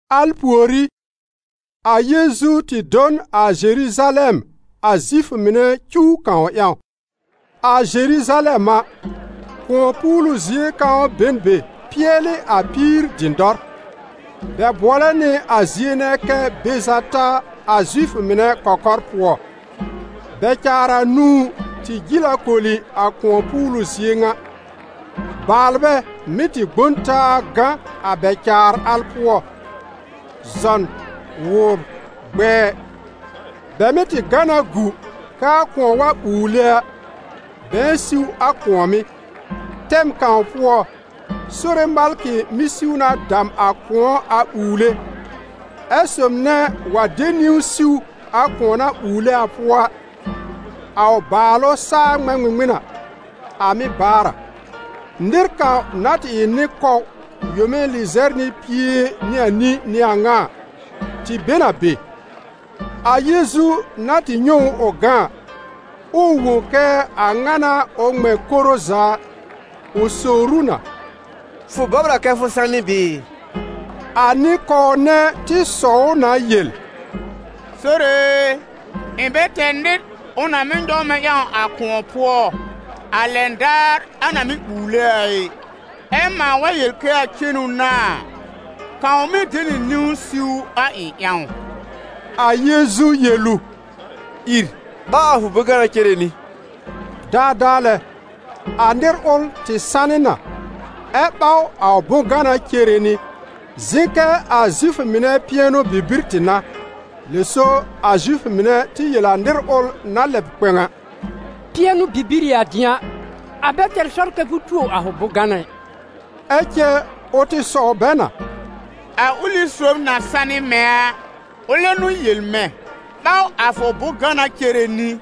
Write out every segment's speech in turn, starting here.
Al pùorí, a Yeezu tɩ do n a Zeruzalɛm a Zifʋ mɩnɛ cuw kãw ƴãw. A Zeruzalɛm a, kʋ̃ɔ-puulu zie kãw be n be pɩɛlɩ a Píir-Dɩdɔr. Bɛ bʋɔlɛ nɩ a zie nɛ kɛ Bezata a Zifʋ mɩnɛ kɔkɔr pʋɔ. Bɛ-caar anũu tɩ jil a koli a kʋ̃ɔ-puulu zie ŋa. Baalbɛ mɩ́ tɩ gbõ n taa gã a bɛ-caar al pʋɔ: zɔn, wʋbr, gbɛɛ. [Bɛ mɩ́ tɩ gã na gu kɛ a kʋ̃ɔ wa ɓuule a, bɛ̃ɛ siw a kʋ̃ɔ̀mɩ́. Tɛm kãw pʋɔ, Sore malkɩ mɩ́ siw na dam a kʋ̃ɔ a ɓuule, ɛ sob nɛ wa de niwn siw a kʋ̃ɔ na ɓuule a pʋɔ a, a ʋ bàalʋ saa ŋmɛ̃ ŋmɩŋmɩn a, a mɩ́ baar a.] Nɩr kãw na tɩ ɩ nɩ-kɔw yome lɩzɛr nɩ pie nɩ anĩ n'ɩ a ŋa a, tɩ be n a be. A Yeezu na tɩ nyɛ̃ ʋ ʋ gã a, ɛ ʋ wõ kɛ a ŋa n'a ʋ ŋmɛ̃ koro za a, ʋ sowr ʋ na: «Fʋ bɔbr a kɛ fʋ sanɩ bɩɩ?» A nɩ-kɔw nɛ tɩ sɔw ʋ na yel: «Sore e, ɩ̃ bɛ tɛr nɩr ʋ na mɩ́ nyɔw mɛ̃ ƴãw a kʋ̃ɔ pʋɔ a lɛn daar a na mɩ́ ɓuule a ɩ, ɛ mãa wa yel kɛ a cenu n'a a, kãw mɩ́ de nɩ niwn siw a ɩ̃ ƴãw.» A Yeezu yel ʋ: «Ìr, ɓaw a fʋ bʋ̃-gana cere nɩ.» Daadaa lɛ, a nɩr ʋl tɩ sanɩ na, ɛ́ ɓaw a ʋ bʋ̃-gana cere nɩ. Zɩ̃ kɛ a Zifʋ mɩnɛ pɩɛnʋ-bibir tɩ n'a. Lɛ so a Zifʋ mɩnɛ tɩ yel a nɩr ʋl na lɛb kpɛ̃w a: «Pɩɛnʋ-bibir ɩ a dɩ̃a, a bɛ tɛr sɔr kɛ fʋ tuo a fʋ bʋ̃-gana ɩ.» Ɛ cɛ ʋ tɩ sɔw bɛ na: «A ʋlɩ sob na sanɩ mɛ̃ a, ʋlɛ n'ʋ yel mɛ̃: ‹Ɓaw a fʋ bʋ̃-gana cere nɩ.›»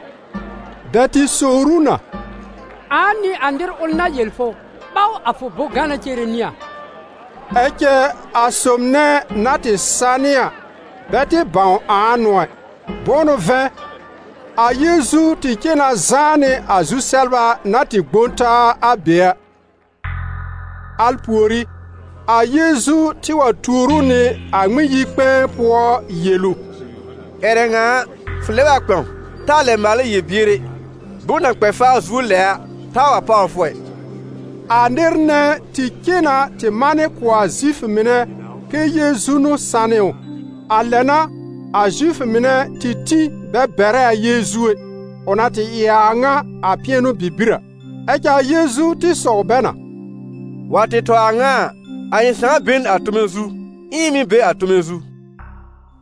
Bɛ tɩ sowr ʋ na: «Ãa n'ɩ a nɩr ʋl na yel fʋ: ‹Ɓaw a fʋ: bʋ̃-gana cere nɩ a?›» Ɛ cɛ a sob nɛ na tɩ sanɩ a bɛ tɩ bãw ãa n'ʋ ɛ. Bʋ̃ʋ n'ʋ vɛ̃, a Yeezu tɩ cen na zãá nɩ a zu-sɛbla na tɩ gbõ taa a be a. Al pùorí, a Yeezu tɩ wa tuor ʋ nɩ a Ŋmɩn-yi-kpɛ̃ɛ pʋɔ yel ʋ: «Ƴɛrɛ ŋa a, fʋ lɛb a kpɛ̃w, taa lɛ maalɛ yel-bier ɛ, bom na kpɛ faa zuo lɛ a taa wa páwr fʋ ɛ.» A nɩr nɛ tɩ cen na tɩ manɩ kʋ̀ a Zifʋ mɩnɛ kɛ Yeezu n'ʋ sanɩ ʋ. A lɛ n'a a Zifʋ mɩnɛ tɩ tĩ bɛ bɛrɛ a Yeezu ɛ, ʋ na tɩ ɩ a a ŋa a pɩɛnʋ-bibir a. Ɛ cɛ a Yeezu tɩ sɔw bɛ na: «Wa tɩ tɔ a ŋa a, a ɩ̃ Sãà be n a tome zu, ɛ ɩ̃ mɩ̀ be a tome zu.»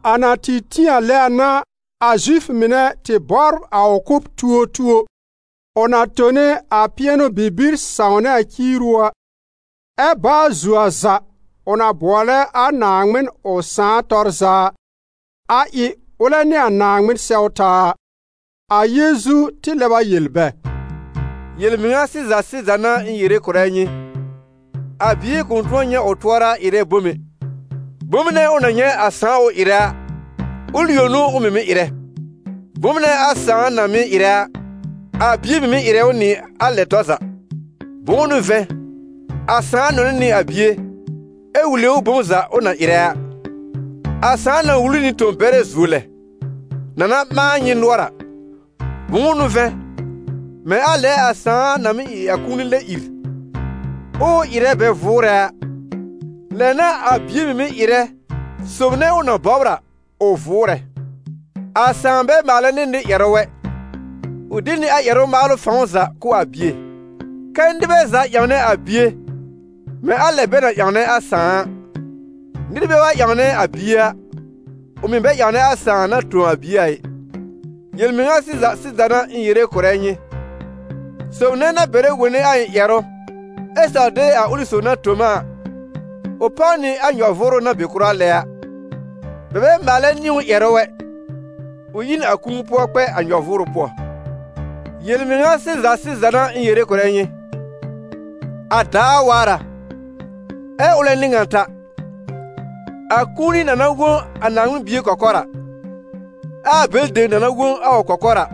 A na tɩ tĩ a lɛ a n'a a Zifʋ mɩnɛ tɩ bɔbr a ʋ kʋ́b tuotuo, ʋ na tone a pɩɛnʋ-bibir sãwnɛ a ciiru a, ɛ́ baa zuo a za ʋ na bʋɔlɛ a Naaŋmɩn ʋ Sãà tɔr za a, a ɩ ʋlɛ nɩ a Naaŋmɩn sɛw taa a. A Yeezu tɩ lɛb a yel bɛ: «Yel-mɩŋa sɩza sɩza n'a ɩ̃ yere kʋ̀rɛ nyɩ: a Bie kʋ̃ tʋ̃ɔ nyɛ̃ ʋ tʋɔra ɩrɛ bom ɛ; bom nɛ ʋ na nyɛ̃ a Sãà ʋ ɩrɛ a, ʋl yõ n'ʋ ʋ mɩ̀ mɩ́ ɩrɛ. Bom nɛ a Sãà na mɩ́ ɩrɛ a, a Bie mɩ̀ mɩ́ ɩrɛ ʋ nɩ a lɛ tɔr za. Bʋ̃ʋ n'ʋ vɛ̃, a Sãà nɔnɛ nɩ a Bie ɛ wule ʋ bom za ʋ na ɩrɛ a. A Sãà na wul ʋ nɩ tõ-bɛrɛ zuo lɛ, na na ɓãa nyɩ nʋɔr a. Bʋ̃ʋ n'ʋ vɛ̃, mɛ̃ a lɛ a Sãà na mɩ́ ɩ a kũuni bɛ lɛ ìr, ɛ ʋ ɩrɛ bɛ vʋʋrɛ a, lɛ n'a a Bie mɩ̀ mɩ́ ɩrɛ sob nɛ ʋ na bɔbr a ʋ vʋʋrɛ. A Sãà bɛ maalɛ nɩ nɩr ƴɛrʋ ɛ, ʋ de nɩ a ƴɛrʋ-maalʋ fãw za kʋ̀ a Bie, kɛ́ nɩbɛ za ƴãwnɛ a Bie, mɛ̃ a lɛ bɛ na ƴãwnɛ a Sãà a. Nɩr bɛ wa ƴãwnɛ a Bie a, ʋ mɩ̀ bɛ ƴãwnɛ a Sãà na tõ a Bie a ɩ. «Yel-mɩŋa sɩza sɩza n'a ɩ̃ yere kʋ̀rɛ nyɩ: sob nɛ na bɛrɛ wone a ɩ̃ ƴɛrʋ ɛ saw de a ʋlɩ sob na tõ m a, ʋ páw nɩ a nyɔ-vʋʋrʋ na be kʋra lɛ a; bɛ bɛ maalɛ nɩ ʋ ƴɛrʋ ɛ, ʋ yi n a kũu pʋɔ kpɛ a n yɔ-vʋʋrʋ pʋɔ. Yel-mɩŋa sɩza sɩza n'a ɩ̃ yere kʋ̀rɛ nyɩ, a daar waar a, ɛ́ ʋlɛ n'ɩ ŋan ta, a kũuni na na wõ a Naaŋmɩn Bie kɔkɔr a, ɛ a bɛlɩ dem na na wõ a ʋ kɔkɔr a,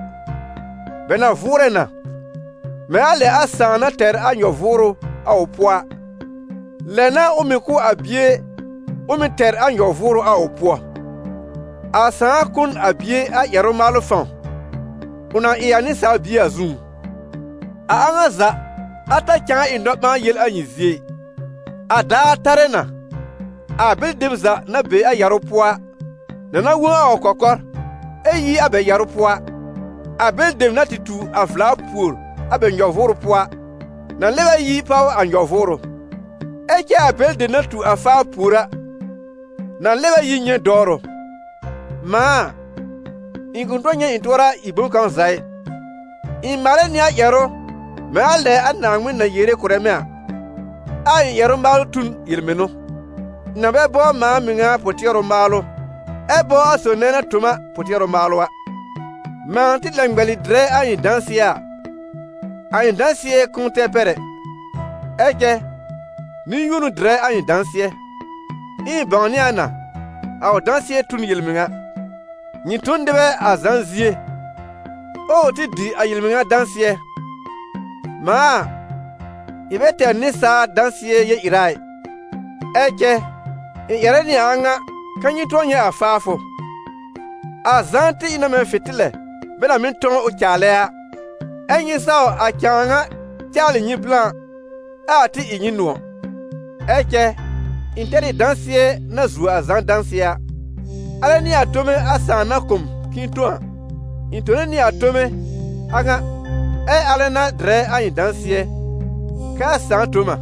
bɛ na vʋʋrɛ na. Mɛ̃ a lɛ a Sãà na tɛr a nyɔ-vʋʋrʋ a ʋ pʋɔ a, lɛ n'a ʋ mɩ̀ kʋ̀ a Bie ʋ mɩ̀ tɛr a nyɔ-vʋʋrʋ a ʋ pʋɔ. A Sãà kʋ̀ n a Bie a ƴɛrʋ-maalʋ fãw, ʋ na ɩ a Nɩsaal Bie a zũú. A a ŋa za, a ta cãa ɩ nɔ-ɓãa-yel a nyɩ zie ɩ. A daar tarɛ na, a bɛlɩ dem za na be a yarʋ pʋɔ a, na na wõ a ʋ kɔkɔr, ɛ yi a bɛ yarʋ pʋɔ a. A bɛlɩ dem na tɩ tu a vla pùor a bɛ nyɔ-vʋʋrʋ pʋɔ a, na lɛb a yi páw a nyɔ-vʋʋrʋ; ɛ cɛ a bɛlɩ dem na tu a faa pùor a, na lɛb a yi nyɛ̃ dɔwrʋ. Mãa a, ɩ̃ kʋ̃ tʋ̃ɔ nyɛ̃ ɩ̃ tʋɔra ɩ bom kãw za ɩ. Ɩ̃ maalɛ nɩ a ƴɛrʋ mɛ̃ a lɛ a Naaŋmɩn na yere kʋ̀rɛ mɛ̃ a, ɛ a ɩ̃ ƴɛrʋ-maalʋ tu n yel-mɩnʋ; ɩ̃ na bɛ bɔbr mãa mɩŋa pʋ-tɩɛrʋ maalʋ, ɛ bɔbr a sob nɛ na tõ m a pʋ-tɩɛrʋ maalʋ a.» «Mãa tɩ lɛ ŋmɛlɩ dɩrɛ a ɩ̃ dãsɩɛ a, a ɩ̃ dãsɩɛ kʋ̃ʋ tɛr pɛr ɛ; ɛ cɛ nɩ-yũo n'ʋ dɩrɛ a ɩ̃ dãsɩɛ; ɛ ɩ̃ bãwnɩ a na, a ʋ dãsɩɛ tu n yel-mɩŋa. Nyɩ tõ n nɩbɛ a Zã zie, ɛ ʋ tɩ dɩ a yel-mɩŋa dãsɩɛ. Mãa a, ɩ̃ bɛ tɛr nɩsaal dãsɩɛ yel-ɩra ɩ, ɛ cɛ ɩ̃ ƴɛrɛ nɩ a a ŋa kɛ́ nyɩ tʋ̃ɔ nyɛ̃ a faafʋ. A Zã tɩ ɩ na mɛ̃ fɩ̃tɩlɛ bɛ na mɩ́ tɔ̃w ʋ caalɛ a: ɛ́ nyɩ saw a cãa ŋa caalɩ nyɩ blã, ɛ a tɩ ɩ nyɩ nʋ̃ɔ̀. Ɛ cɛ ɩ̃ tɛr ɩ dãsɩɛ na zuo a Zã dãsɩɛ a: alɛ n'ɩ a tome a Sãà na kʋ̀ m k'ɩ̃ɩ tõ a; ɩ̃ tone nɩ a tome a ŋa, ɛ alɛ n'a dɩrɛ a ɩ̃ dãsɩɛ kɛ a Sãà tõ m a.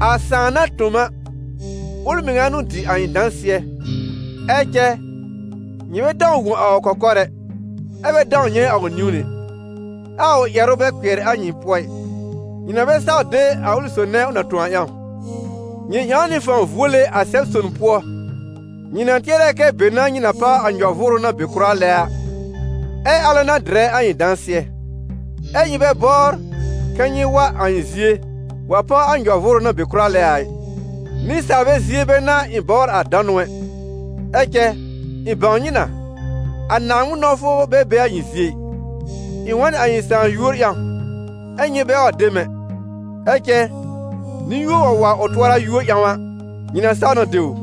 A Sãà na tõ m a, ʋl mɩŋa n'ʋ dɩ a ɩ̃ dãsɩɛ. Ɛ cɛ nyɩ bɛ dãw wõ a ʋ kɔkɔr ɛ, ɛ bɛ dãw nyɛ̃ a ʋ niwn ɛ, ɛ a ʋ ƴɛrʋ bɛ kpɩɛr a nyɩ pʋɔ ɩ, nyɩ na bɛ saw de a ʋlɩ sob nɛ ʋ na tõ a ƴãw. Nyɩ ƴãw nɩ fãw vuole a Sɛb-son pʋɔ, nyɩ na tɩɛrɛ kɛ be n'a nyɩ na páw a nyɔ-vʋʋrʋ na be kʋra lɛ a, ɛ alɛ n'a dɩrɛ a ɩ̃ dãsɩɛ. Ɛ nyɩ bɛ bɔbr kɛ nyɩ wa a ɩ̃ zie wa páw a nyɔ-vʋʋrʋ na be kʋra lɛ a ɩ. «Nɩsaalbɛ zie bɛ n'a ɩ̃ bɔbr a danʋ ɛ. Ɛ cɛ ɩ̃ bãw nyɩ na, a Naaŋmɩn nɔ̃wfʋ bɛ be a nyɩ zie ɩ. Ɩ̃ wa n a ɩ̃ Sãà yúor ƴãw, ɛ́ nyɩ bɛ wa de m ɛ. Ɛ cɛ nɩ-yũo wa wa ʋ tʋɔra yúor ƴãw a, nyɩ na saw na de ʋ!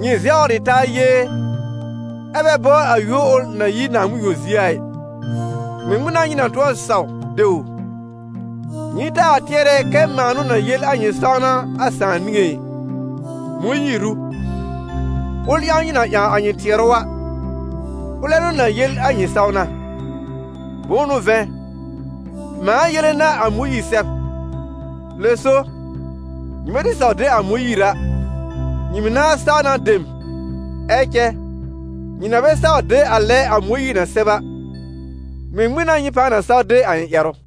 Nyɩ zɛwr ɩ taa yee, ɛ́ bɛ bɔbr a yúor ʋl na yi Naaŋmɩn yõ zie a ɩ, ŋmɩŋmɩn n'a nyɩ na tʋ̃ɔ saw de ʋ? Nyɩ taa tɩɛrɛ kɛ mãa n'ʋ na yel a nyɩ sãwna a Sãà niŋé ɩ: Mõyiir ʋ, ʋl ƴãw nyɩ na ƴãw a nyɩ tɩɛrʋ a, ʋlɛ n'ʋ na yel a nyɩ sãwna. Bʋ̃ʋ n'ʋ vɛ̃, mãa yele n'a a Mõyiir sɛb, lɛ so, nyɩmɛ tɩ saw de a Mõyiir a, nyɩ mɩ̀ nãá saw na de m. Ɛ cɛ nyɩ na bɛ saw de a lɛ a Mõyiir na sɛb a, ŋmɩŋmɩn n'a nyɩ pãa na saw de a ɩ̃ ƴɛrʋ?»